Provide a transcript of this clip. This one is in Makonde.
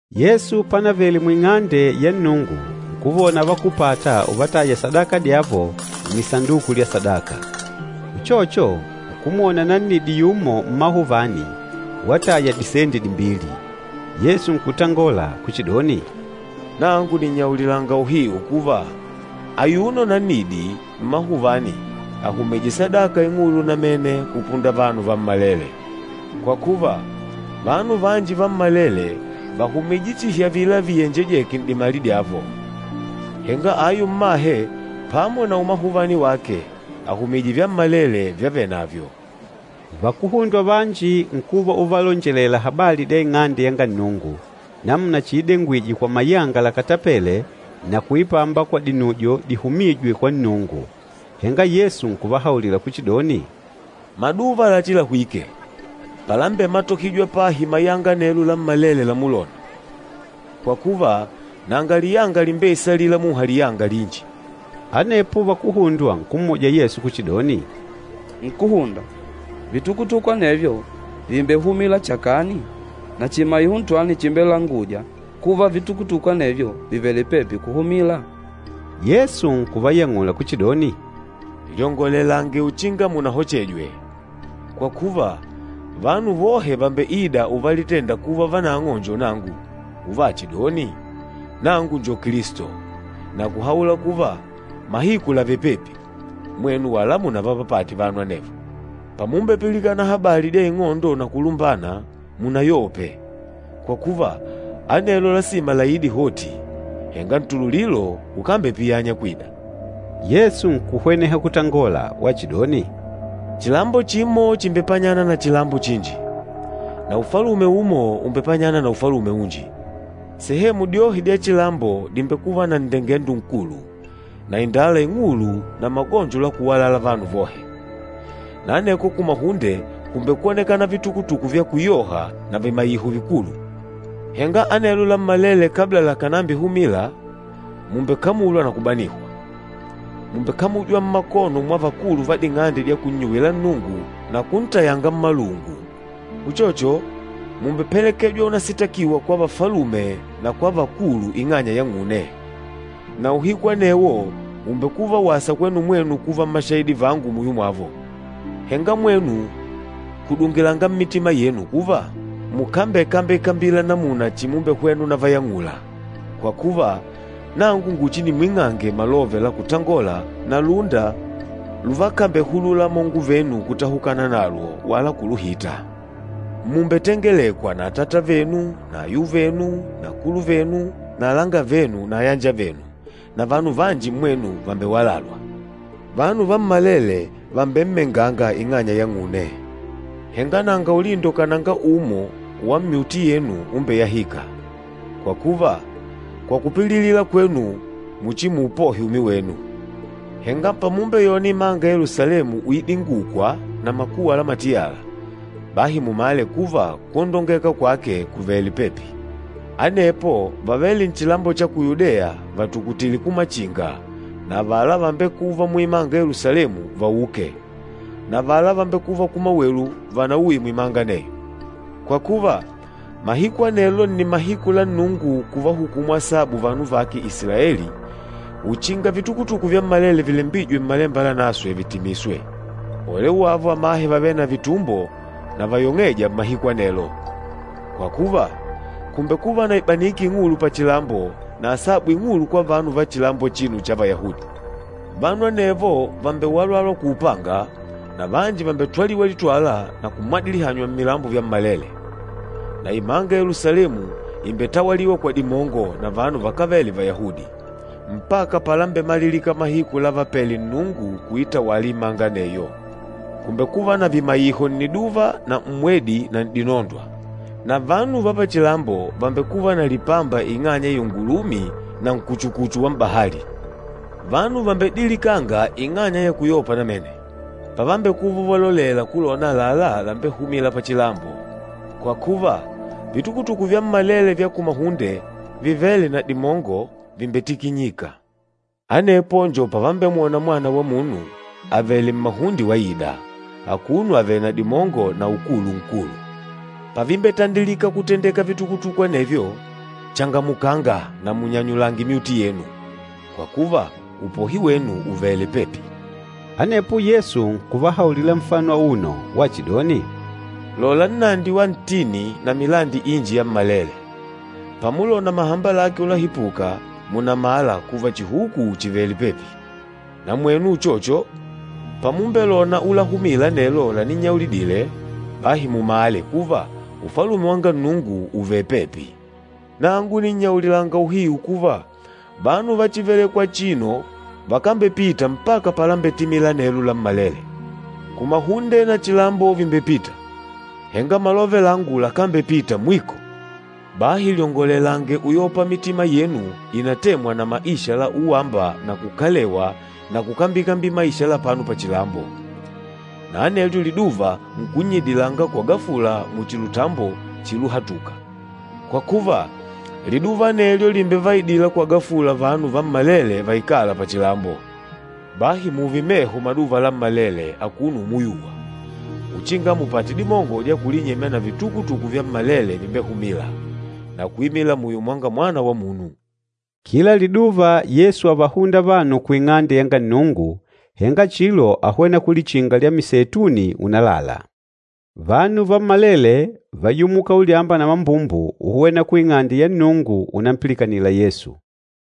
Yesu panavele mu Ing'ande ya Nnungu nkuvona vakúpata uvataya sadaka dyavo nnisanduku lya sadaka. Uchocho nkumwona nannidi yumo mmahuvani wataya disendi dimbili. Yesu nkutangola kuchidoni, “Nangu nìnnyaulilanga uhiu kuva, ayuno nannidi mmahuvani àhumije sadaka ing'ulu namene kupunda vanu vammalele. Kwa kuva, vanu vanji vammalele vàhumije chihi avila viyenjejêke n'dimali dyavo, henga ayu mmahe pamo na umahuvani wake, àhumije vyammalele vyavenavyo.” Vakuhundwa vanji nkuva uvalonjelela habali dya Ing'ande yanga Nnungu, namuna chiidengwije kwa mayanga lakatapêle na kuipamba kwa dinujo dihumîjwe kwa Nnungu. Henga Yesu nkuvahaulila kuchidoni, “Maduva lachilahwike, palambematohijwa pahi mayanga anelo lammalele lamulona, kwa kuva nanga liyanga limbeisalîla muha liyanga linji.” Anepo vakuhundwa nkummuja Yesu kuchidoni, “Nkúhunda, vitukutuku anevyo vìmbehumila chakani? Na chimaiho ntwani chimbelangûja kuva vitukutuku anevyo vìvele pepi kuhumila?” Yesu nkuvayang'ula kuchidoni, “Lyongolelange uchinga munahochejwe. Kwa kuva, vanu vohe vàmbeida uvalitenda kuva vanang'o njo nangu, uvachidoni, ‘Nangu njo Kilisto,’ na kuhaula kuva, ‘Mahiku làvele pepi.’ Mwenu wala munavapapate vanu anevo. Pamumbepilikana habali dya ing'ondo na kulumbana, munayope, kwa kuva, anelo lasima laide hoti, henga ntululilo ukambepiyanya kwida.” Yesu nkuhweneha kutangola wachidoni, “Chilambo chimo chìmbepanyana na chilambo chinji, na ufalume umo ùmbepanyana na ufalume unji. Sehemu dyohe dya chilambo dìmbekuva na nndengendo nkulu, na indala ing'ulu na magonjo la kuwalala vanu vohe, na aneko kumahunde kùmbekwonekana vitukutuku vya kuyoha na vimaiho vikulu. Henga anelo lammalele kabla lakànambihumila, mùmbekamulwa na kubanihwa. Mùmbekamujwa mmakono mwa vakulu va ding'ande dya kunnyuwila Nnungu na kuntayanga mmalungu. Uchocho, mùmbepelekejwa unasitakiwa kwa vafalume na kwa vakulu ing'anya yang'une, na uhiku anewo ùmbekuva wasa kwenu mwenu kuva mmashahidi vangu muyo mwavo. Henga mwenu kudungilanga mmitima yenu kuva, mukambekambikambila namuna chimumbehwena unavayang'ula, kwa kuva, nangu nguchinimwing'ange malove la kutangola na lúnda luvakambehulula amongo venu kutahukana nalwo wala kuluhita. Mùmbetengelekwa na atata venu na ayuvenu na akuluvenu na alangavenu na ayanjavenu, na vanu vanji mmwenu vàmbewalalwa. Vanu vammalele vàmbemmenganga ing'anya yang'une. Henga nanga ulindo kananga umo wa myuti yenu umbeyahîka. Kwa kuva, kwa kupililila kwenu muchimuupohe umi wenu. Henga pamumbeyona imanga ya Yelusalemu uidingukwa na makuwa la matiyala, bahi mumale kuva kwondongeka kwake kùvele pepi. Anepo vavêle nchilambo cha ku Yudeya vatukutile kumachinga na avala vambekûva muimanga ya Yelusalemu vauke, na avala vambekûva kumawelu vanauye muimanga aneyo. Kwa kuva, mahiku anelo nni mahiku la Nnungu kuvahukumu asabu vanu vake Isilaeli uchinga vitukutuku vyammalele vilembwîje Mmalemba Lanaswe vitimiswe. Ole wavo amahe vavêle na vitumbo na vayong'êja mmahiku anelo! Kwa kuva, kùmbekuva na ibaniki ing'ulu pachilambo na asabu ing'ulu kwa vanu va chilambo achino cha Vayahudi. Vanu anevo vàmbewalalwa kwa upanga, na vanji vàmbetwaliwa litwala na kumwadilihanywa mmilambo vyammalele, na imanga ya Yelusalemu ìmbetawaliwa kwa dimongo na vanu vakávele Vayahudi, mpaka palambemalilika mahiku lávapèlè Nnungu kuitawala imanga aneyo. Kùmbekuva na vimaiho nniduva na mmwedi na n'dinondwa. Na vanu va pachilambo vàmbekuva na lipamba ing'anya ya iungulumi na nkuchukuchu wa m'bahali. Vanu vàmbedilikanga ing'anya ya kuyopa namene, pavambekuva uvalolela kulona àlalá lambehumîla pachilambo, kwa kuva, vitukutuku vyammalele vya kumahunde vivêle na dimongo, vìmbetikinyika. Anepo njo pavambemwona Mwana wa Munu avèlè mmahunde waida, akuno avèlè na dimongo na ukulu nkulu. Pavimbetandilika kutendeka vitukutuku anevyo, changamukanga na munyanyulange myuti yenu, kwa kuva, upohi wenu ùvele pepi.” Anepo Yesu nkuvahaulila nfano auno wachidoni, “Lola nnandi wa ntini na milandi inji yammalele. Pamulona mahamba lake ulahipuka, mùnamala kuva chihuku chìvele pepi. Na mwenu uchocho, pamumbelona ulahumila anelo laninnyaulidile, bahi mumale kuva Ufalume wanga Nnungu ùvele pepi. Nangu nìnnyaulilanga uhiu kuva, vanu va chívelèkwà achino vakambepita mpaka palambetimila anelo lammalele. Kumahunde na chilambo vìmbepita, henga malove langu lakambepita mwiko.” “Bahi lyongolelange uyopa mitima yenu ìnatemwa na maisha la uwamba na kukalewa na kukambikambila maisha la apano pachilambo, na anelyo liduva nkunnyidilanga kwa gafula muchi lutambo chiluhatuka. Kwa kuva, liduva anelyo lìmbevaidila kwa gafula vanu vammalele vaikâla pachilambo. Bahi mùùve meho maduva lammalele akuno umuyuwa, uchinga mupate dimongo dya kulinyemya na vitukutuku vyammalele vimbehumîla, na kuimila muyo mwanga Mwana wa Munu.” Kila liduva Yesu ávahunda vanu ku Ing'ande yanga Nnungu, henga chilo áhwena kulichinga lya Miseituni unalala. Vanu vammalele váyumuka ulyamba na mambumbu uhwena ku Ing'ande ya Nnungu unampilikanila Yesu.